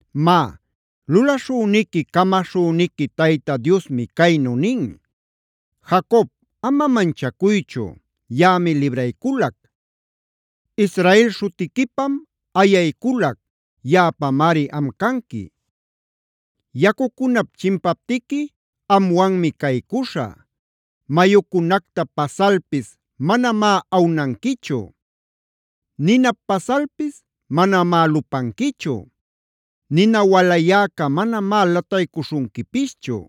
Má, lulaśhüniqui, camaśhüniqui Tayta Diosmi caynu nin: “Jacob, ama manchacuychu; yaꞌami librayculac. Israel śhutiquipam ayayculac; yaꞌapamari am canqui. Yacucunap chimpaptiqui amwanmi caycuśhä; mayucunacta pasalpis manamá anuanquichu. Ninap pasalpis manamá lupanquichu; nina walayäca manamá lataycuśhunquipischu.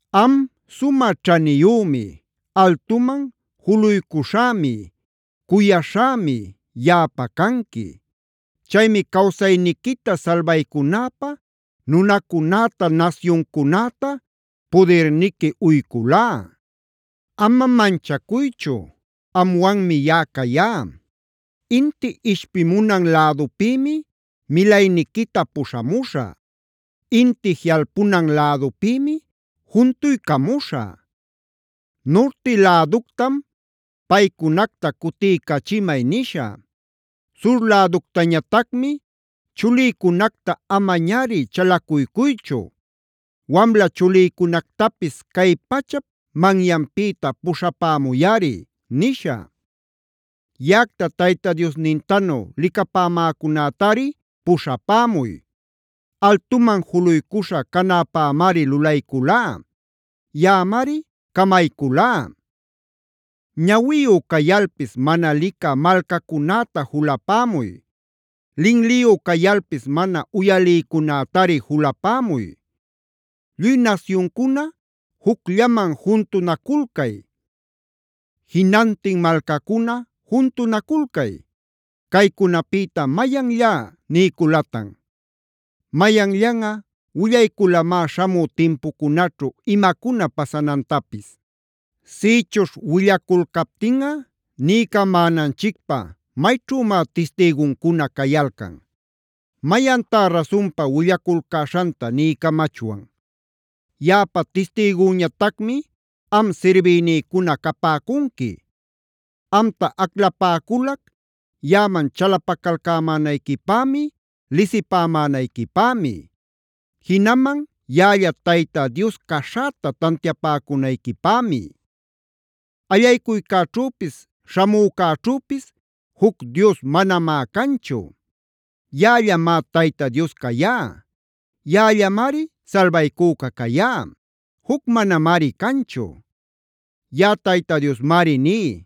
Am, sumä ćhaniyümi, altuman juluycuśhämi, cuyaśhämi yaꞌapä canqui. Chaymi cawsayniquita salbaycunäpä nunacunäta, nasyuncunäta pudirniqui uyculá. “Ama manchacuychu; amwanmi yaꞌa cayá. Inti ishpimunan lädupïmi milayniquita puśhamuśhä; inti jiꞌalpunan lädupïmi juntuycamuśhä. Nurti läductam ‘Paycunacta cutiycachimay’ nishä. Sur läductañatacmi: ‘Chulïcunacta amañari chalacuycuychu. Wamla chulïcunactapis cay pachap manyanpïta puśhapämuyꞌari’ nishä. Yaꞌacta Tayta Diosnintanu licapämäcunätari puśhapämuy; altuman juluycuśha canäpämari lulayculá; yaꞌamari camayculá. “Ñawiyu cayalpis mana licä malcacunäta julapämuy; linliyu cayalpis mana uyalïcunätari julapämuy. Lluy nasyuncuna jucllaman juntunaculcay; jinantin malcacuna juntunaculcay. Caycunapïta ¿mayanllá niyculatan? ¿Mayanllanꞌa willayculamá śhamü timpucunaćhu imacuna pasanantapis? Sïchuśh willaculcaptinꞌa niycamänanchicpä ¿mayćhümá tistïguncuna cayalcan? ¿Mayantá rasunpa willaculcäśhanta niycamachwan? “Yaꞌapa tistïgüñatacmi am sirbïnïcuna capäcunqui; amta aclapäculac yaꞌaman chalapacalcämänayquipämi, lisipämänayquipämi; jinaman yaꞌalla Tayta Dios caśhäta tantiapäcunayquipämi. Allaycuycäćhüpis śhamücäćhüpis juc dios manamá canchu. Yaꞌallamá Tayta Dios cayá; yaꞌallamari salbaycüca cayá;a juc manamari canchu. Yaꞌa Tayta Diosmari ní: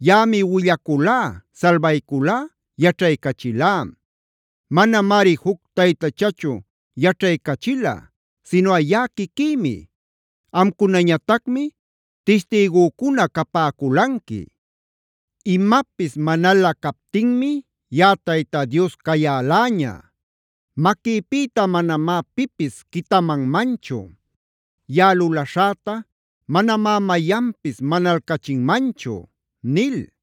‘Yaꞌami willaculá, salbayculá, yaćhaycachilá. Manamari juc taytachachu yaćhaycachila sinuꞌa yaꞌa quiquïmi. Amcunañatacmi tistïgücuna capäculanqui. Imapis manalä captinmi yaꞌa Tayta Dios cayäläña. Maquïpïta manamá pipis quitamanmanchu. Yaꞌa lulaśhäta manamá mayanpis manalcachinmanchu’” nil.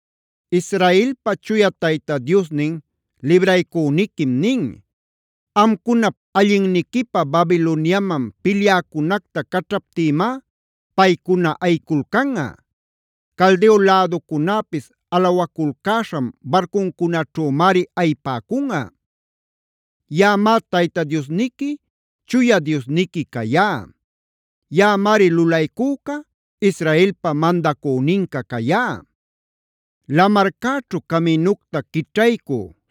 Israelpa Chuya Tayta Diosnin, libraycüniquim nin: “Amcunap allinniquipä Babiloniaman pilyäcunacta caćhaptïmá paycuna ayiculcanꞌa; Caldeo läducunäpis alawaculcäśhan barcuncunaćhümari ayipäcunꞌa. Yaꞌamá Tayta Diosniqui, Chuya Diosniqui cayá. Yaꞌamari lulaycüca, Israelpa mandacüninca cayá. Lamarcäćhu caminucta quićhaycü,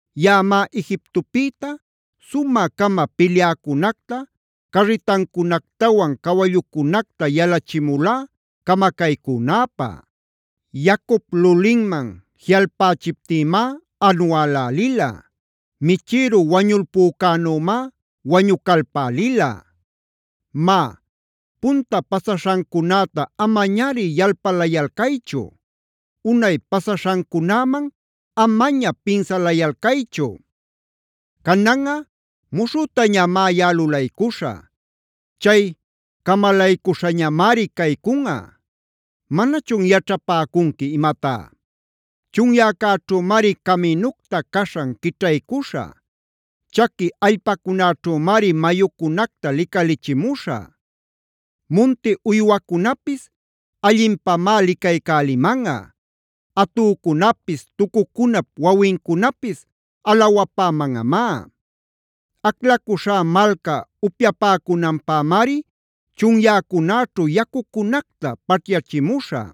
Yaꞌamá Egiptopïta sumä-cama pilyäcunacta carritancunactawan cawallucunacta yalachimulá camacaycünäpä. Yacup lulinman jiꞌalpächiptïmá anualälila; michïru wañulpücänümá wañucalpälila. “Má, punta pasaśhancunäta amañari yalpalayalcaychu; unay pasaśhancunäman amaña pinsalayalcaychu. Cananꞌa muśhütañamá yaꞌa lulaycuśhä. Chay camalaycuśhañamari caycunꞌa. ¿Manachun yaćhapäcunqui imatá? Chunyäcäćhümari caminucta caśhan quićhaycuśhä; chaqui allpacunäćhümari mayucunacta licalichimuśhä. Munti uywacunapis allinpamá licaycälimanꞌa; atücunapis, tucucunap wawincunapis alawapämanꞌamá. Aclacuśhá malca upyapäcunanpämari chunyäcunäćhu yacucunacta paćhyachimuśhä.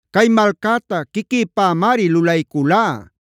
Cay malcäta quiquïpämari lulayculá;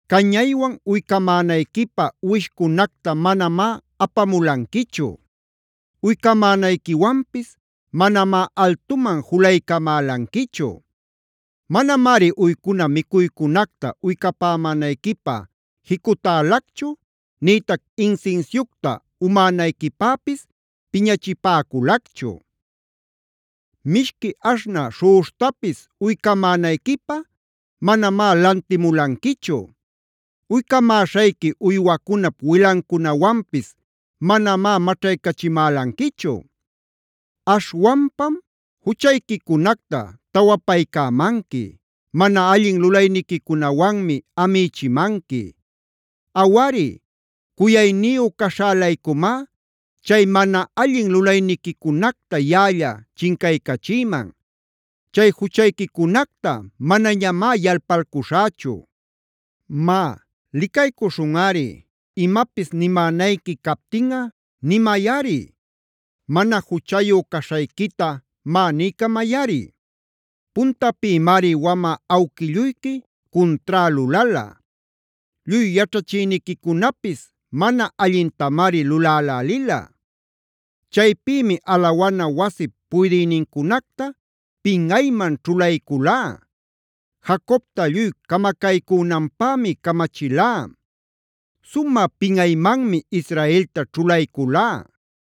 Cañaywan uycamänayquipä uwishcunacta manamá apamulanquichu. Uycamänayquiwanpis manamá altuman julaycamälanquichu. Manamari uycuna micuycunacta uycapämänayquipä jicutälacchu nïtac insinsiucta umänayquipäpis piñachipäculacchu. Mishqui aśhnä śhuꞌuśhtapis uycamänayquipä manamá lantimulanquichu; uycamäśhayqui uywacunap wilancunawanpis manamá maćhaycachimälanquichu. Aśhwanpam juchayquicunacta tawapaycämanqui; mana allin lulayniquicunawanmi amïchimanqui. “Awari, cuyacuyniyu caśhä-laycumá, chay mana allin lulayniquicunacta yaꞌalla chincaycachïman; chay juchayquicunacta manañamá yalpalcuśhächu. Má, licaycuśhunꞌari; imapis nimänayqui captinꞌa, nimayꞌari; mana juchayu caśhayquita má niycamayꞌari. Puntapïmari wamä awquilluyqui cuntrá lulala; lluy yaćhachïniquicunapis mana allintamari lulälälila. Chaypïmi alawana wasip puydïnincunacta pinꞌayman ćhulayculá; Jacobta lluy camacaycünanpämi camachilá; sumä pinꞌaymanmi Israelta ćhulayculá.